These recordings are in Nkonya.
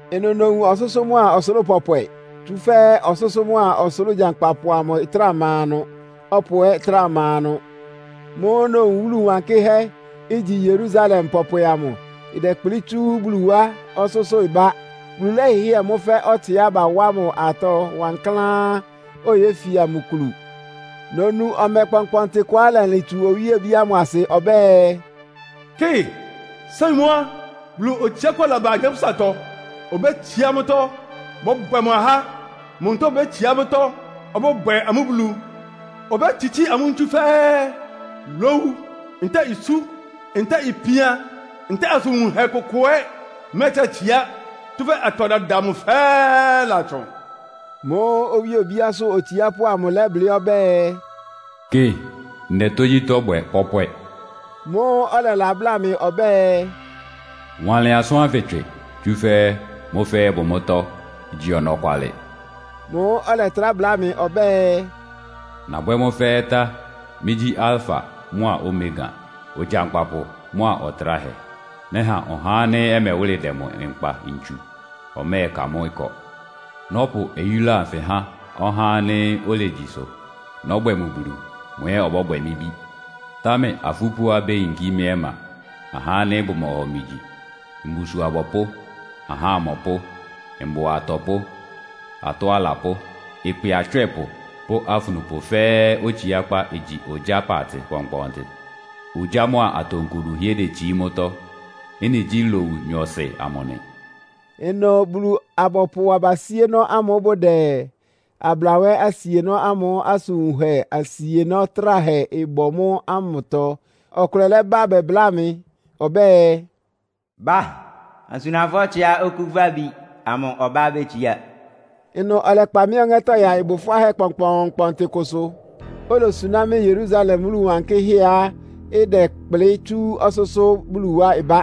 Ɩnʋ nowun ɔsʋ́sʋ́ mʋ́a ɔsʋlʋ́ʋ pɔpwɛ, tsúfɛ́ ɔsʋ́sʋ́ mʋ́a ɔsʋlʋ́ʋ gyankpapʋ amʋ ɩtráa ma ɩnʋ. Ɔpʋ ɛ́ ɩtráa ma ɩnʋ. Mʋ́ʋ́ nowun wúlu wankɩ́hɛ́, igyi Yerusalem pɔpwɛ amʋ, ɩdɛkplɩ́ tsú Bulu wá ɔsʋ́sʋ́ ɩbá. Bulu lɛ́hɩhɩ́ɛ mʋ́ fɛ́ ɔtsɩá bawá mʋ atɔ́ wankláán, oyéfia mʋ kulu. Nonu ɔmɛ kpɔnkpɔntɩ kʋá ɩlɛlɩn tsu owíe obíá ámʋ asɩ ɔbɛ́ɛ, “Kɩ! Séi mʋ́ á, Bulu otsiákpá laba anyánkpʋ́satɔ. Obétsiá amʋ́tɔ́, bɔ́bwɛ mʋ ahá. Mʋ onutó obétsiá amʋ́tɔ́, ɔbɔ́bwɛ amʋ́ Bulu. Obétsitsíi amʋ́ ntsú fɛ́ɛ́. Lowu ntɛ́ɛ isú ntɛ́ɛ ipian ntɛ́ɛ asʋn wunhɛ kʋkʋ ɛ́ ɩmɛ́ɛtrá tsiá, tsúfɛ́ atɔ dada amʋ fɛ́ɛ́ ɩlatsʋn.” Mʋ́ʋ́ owíe obíásʋ́ otsiápʋ́ amʋ lɛ́blɩ́ ɔbɛ́ɛ, “Kɩ, ndɛ tógyítɔ́ bwɛ pɔ́pwɛ.” Mʋ́ʋ́ ɔlɛlabláa mɩ ɔbɛ́ɛ, “Wanlɩn asʋ́n ánfɩ tswɩ, tsúfɛ́ mʋ́ fɛ́ɛ́ ɩbʋ mʋ́tɔ́, igyi ɔnɔkwalɩ.” Mʋ́ʋ́ ɔlɛtrá bla mɩ ɔbɛ́ɛ “Nabwɛ́ mʋ́ fɛ́ɛ́ tá. Mɩ́gyí Alfa mʋ́a Omega, Ogyankpapʋ mʋ́a Ɔtráhɛ. Nɛ́ha ɔhá ánɩ́ ɔmɛwʋ́lɩ dɛ mʋ nkpa-ntsu, ɔmɛ́ɛka mʋ́ ɩkɔ. Nɔ́pʋ oyúla anfɩ há ɔhá ánɩ́ olegyi ɩsʋ. Nɔ́bwɛ mʋ Bulu, mʋ ɛ́ ɔbɔ́bwɛ mɩ́ bí. Támɛ afúpʋ́á beyinkí mɩ́ ɔma, ahá ánɩ́ bʋmɔhɔ mɩ gyi, mbusuo abɔpʋ́, ahá amɔpʋ́, mbʋa atɔpʋ́, atɔ́ alapʋ́, ɩkpɩ atswɛ́pʋ pʋ́ afunupʋ fɛ́ɛ́ otsiákpá gyí ogyá paatɩ kpɔnkpɔntɩ, ogyá mʋ́a atonkodu ɩhɩ́ɛ́ detsií mʋ́tɔ́. Ɩ́nɩ gyí lowu nyɔɔsɩ amʋ nɩ.” Ɩnʋ Bulu-abɔpʋ abasíénɔ́ ámʋ́ʋ́ bʋdɛ ablanwɛ́ asienɔ́ ámʋ́ʋ́ asʋn wunhɛ asienɔ́ tráhɛ ɩbɔ mʋ́ ámʋtɔ ɔkʋlɛ lɛ́ba bɛbláa mɩ ɔbɛ́ɛ, “Ba, ansuna fʋ́ ɔtsɩá Okúfabi amʋ ɔbá betsiá.” Ɩnʋ ɔlɛkpa mɩ́ Ɔŋɛ́tɔ́ ya ɩbʋ fʋ́áhɛ́ kpɔnkpɔɔnkpɔntɩ kʋsʋ, olosuná mɩ́ Yerusalem wúlu wankɩ́hɛ́á ɩdɛkplɩ́ tsú ɔsʋ́sʋ́ Bulu wá ɩbá.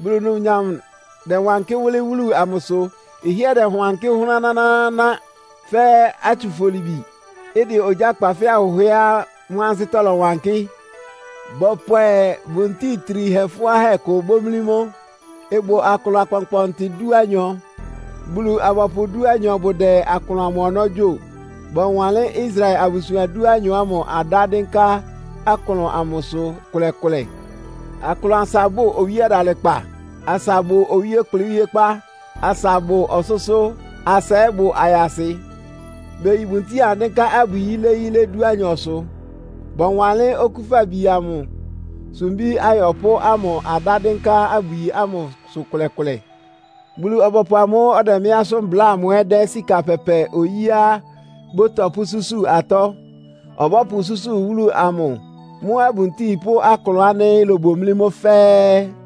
Bulu numnyam dɛwankɩ́ wʋ́lɩ́ wúlu ámʋsʋ, ɩhɩ́ɛ́ dɛwankɩ́ hʋ́nánááná fɛ́ atsufolibi, ɩdɛ ogyá kpa fɛ́ ahʋhwɛ́á mʋ́ ansɩ́tɔ́ lɔwankɩ́. Bɔpwɛ buntíi trihɛ fʋ́áhɛ́ kʋ bómlí mʋ́, ɩbʋ aklʋn akpɔnkpɔntɩ dúanyɔ. Bulu-abɔpʋ dúanyɔ bʋdɛ aklʋn ámʋ ɔnɔ́ gyo. Bɔwanlɩ́n Israel abusuan dúanyɔ ámʋ adá dɩ́nká aklʋn amʋsʋ ɩkʋlɛ-kʋlɛ. Aklʋn asa bʋ owí ɔdalɩkpa. Asa bʋ owí ɔkplɩ́wíékpá, asa bʋ ɔsʋ́sʋ́, asa ɛ́ bʋ ayasɩ. Beyi buntíi amʋ dɩ́nká abwi yíléyílé dúanyɔsʋ. Bɔwanlɩ́n Okúfabi amʋ sumbí ayɔpʋ́ amʋ adá dɩ́nká abwi ámʋsʋ ɩkʋlɛ-kʋlɛ. Bulu-ɔbɔpʋ amʋ́ʋ́ ɔdɛ mɩ́ asʋ́n bláa amʋ dɛ́ sika pɛpɛ oyíá bʋtɔpʋ́súsu atɔ́. Ɔbɔ́pʋsúsu wúlu amʋ, mʋ́ abuntíi pʋ́ aklʋn ánɩ́ ilobomlí mʋ́ fɛ́ɛ́.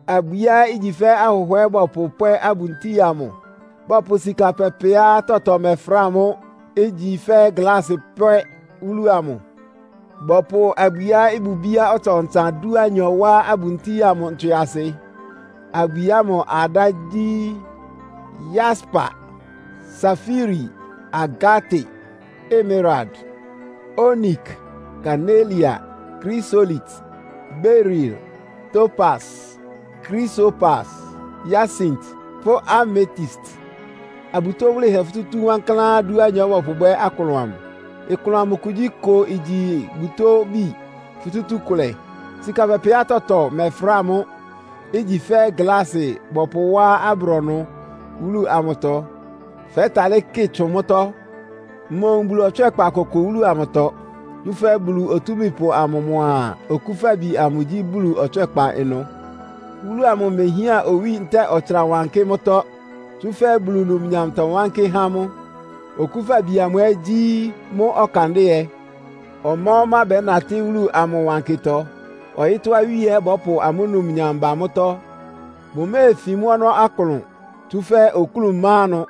Abwiá igyi fɛ́ ahʋhwɛ́ bɔpʋpwɛ́ abuntíi amʋ. Bɔpʋ sika pɛpɛá tɔtɔ mɛfráa mʋ́, igyi fɛ́ gláasɩ pwɛ́ wúlu amʋ. Bɔpʋ abwiá ɩbʋ bíá ɔtsan-ɔtsan dúanyɔ wá abuntíi amʋ ntswɩasɩ. Abwi ámʋ adá gyí, yaspa, safiri, agate, emerad. Onik, kanelia, krisolit, beril, topas, krisopas, yasint pʋ́ ametiste. Abutó wʋlɩhɛ fútútú wankláán dúanyɔ bɔpʋbwɛ́ aklʋn amʋ. Ɩklʋn amʋ kugyíkʋ igyi butóbi fútútú kʋlɛ. Sika pɛpɛá tɔtɔ mɛfráa mʋ́, igyi fɛ́ gláasɩ bɔpʋwá abrɔnʋ wúlu amʋtɔ. Fɛ́talɩ́ kɩ tsʋn mʋ́tɔ́. Mmowun Bulu ɔtswɛ́kpa kʋkʋ wúlu amʋtɔ, tsúfɛ́ Bulu Otúmípʋ amʋ mʋa Okúfabi amʋ gyí Bulu ɔtswɛ́kpa ɩnʋ. Wúlu amʋ imehián owí ntɛ́ɛ ɔtsra wankɩ́ mʋ́tɔ́, tsúfɛ́ Bulu numnyam tɔwánkɩ́ há mʋ́, Okúfabi amʋ ɛ́ gyí mʋ́ ɔkandɩ́ɛ. Ɔmá-ɔmá bɛ́natɩ́ wúlu amʋ wankɩtɔ. Ɔyɩ́tɔ́ awíe ɛ́ bɔ́pʋ amʋ́ numnyam ba mʋ́tɔ́. Bʋméefin mʋ́ ɔnɔ́ aklʋn, tsúfɛ́ oklún ma ɩnʋ.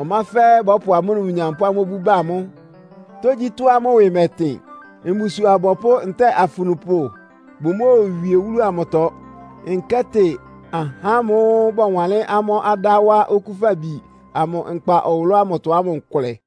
Ɔmá fɛ́ɛ́ bɔ́pʋ amʋ́ numnyam pʋ́ amʋ́ obú ba mʋ́. Tógyítɔ́á mʋ́ ɩwɩ mɛtɩn, mbusuo abɔpʋ́ ntɛ́ɛ afunupʋ bʋmóowie wúlu amʋtɔ, nkɛ́tɩ ahá ámʋ́ʋ́ bɔwanlɩ́n amʋ́ adá wá Okúfabi amʋ nkpa ɔwʋlʋ́tɔ́ amʋ nkʋlɛ.